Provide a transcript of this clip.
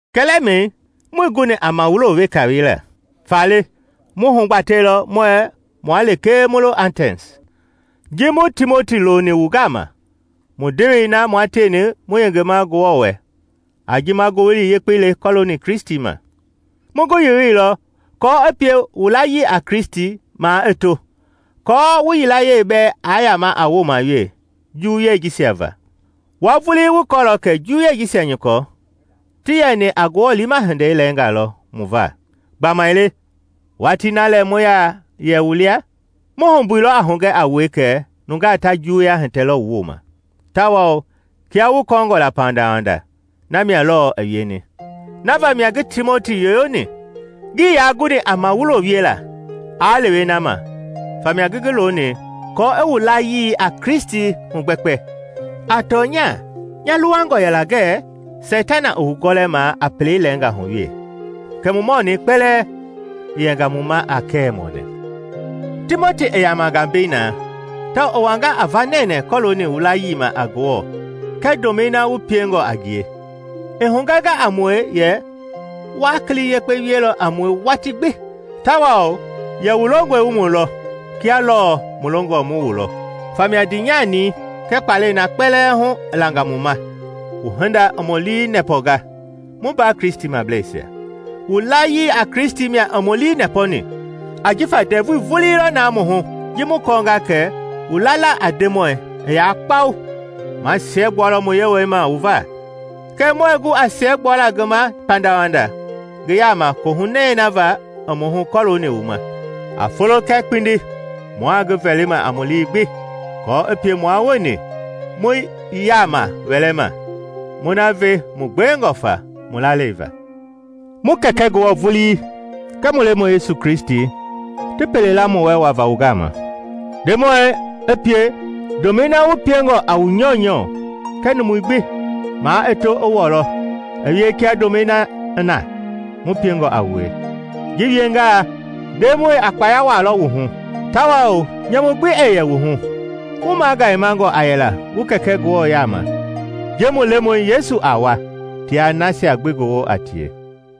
Kɛlɛmɛi muii guni a mawulo weka wiela. Faale mu hugbatɛilɔ muɛɛ mua lekee mu lo Atɛns, ji mu Timoti loni wu gama, mu ndewei na mua tieni mu yengema Ngewɔ wɛ a ji ma Ngowili Yekpei le kɔɔlooni Kristi ma. Mu ngi yoyoilɔ aako i pie wu layii a Kristi maa i to, aako wu yilayee bɛɛ aa yama a wooma wee juwuyei jisia va. Wua vulii wu kɔɔlɔ kɛ juwuyei jisia nyɔkɔ ti yɛni a Ngewɔ liima hindei lɛɛngaa lɔ mu va. Gbamaile watii na lɛ mu yɛ wu lia, mu humbuilɔ a hugɛ a wue kɛ nungaa ta juwuya hitɛlɔ wu wooma; tawao kia wu kɔɔngɔ la pandawanda, na mia lɔɔ i wieni. Na vamia ngi Timoti yoyoni. Ngii yaa guni a mawulo wiela aa lewe na ma, famia ngi ngi loni kɔɔ i wu layii a Kristi hugbɛkpɛ. A tɔnya nya luwangɔ yɛla ngɛ Seitana i wu gɔlɛma a pelei lɛɛnga hu we, kɛ mu mɔnɛi kpɛlɛɛ i yɛnga mu ma a kɛwɛ mɔnɛ! Timoti i yamanga mbei na tawao i wanga a va nɛnɛɛ kɔlooni wu layii ma a Ngewɔ kɛɛ ndomɛi na wu piengɔ a ngie. I hugɛnga a mue yɛ wa kili yekpe wielɔ a mue watii gbi, tawao yɛ wu longɔe wu mu lɔ kia lɔɔ mu longɔ mu wu lɔ. Famia ndiinyani kɛɛ kpalɛi na kpɛlɛɛ hu i langa mu ma, wu hinda i mu lii nɛpɔnga, mu mbaa Kristimableisia. Wu layii a Kristi mia i mu lii nɛpɔni, ajifa ndɛvui vulii lɔ na mu hu ji mu kɔɔnga kɛ wu lala a Ndemɔi i ya kpau. Ma siɛgbualɔ mu Yewɔɛi ma wu va. Kɛɛ muɛɛ gu a siɛgbuala ngi ma pandawanda ngi yaama kohunɛi va i mu hu kɔlooni wu ma. A folo kɛɛ kpindi mua ngi vɛlima a mu lii gbi aako i pie mua wueni mu yaama wɛlɛ ma, mu na ve wu gbewengɔ fa wu lalei va. Mu Kɛkɛ Ngewɔ vulii kɛɛ mu Lemɔi Yesu ti pele la mu wɛ wava wu gama. Ndemɔi i pie ndomɛi na wu peingɔ a wu nyɔunyɔ kɛɛ numui gbi maa i to i wɔlɔ i wie kia ndomɛi na i na mu piengɔ a wue. Ji wiengaa, Ndemɔi a kpaya wuaalɔ wu hu, tawao nyamu gbi ɛɛ yɛ wu hu wu magayemangɔ a yɛla mu Kɛkɛ Ngewɔ yaama ji mu Lemɔi Yesu a wa tia nasia gbi ngi woo a tie.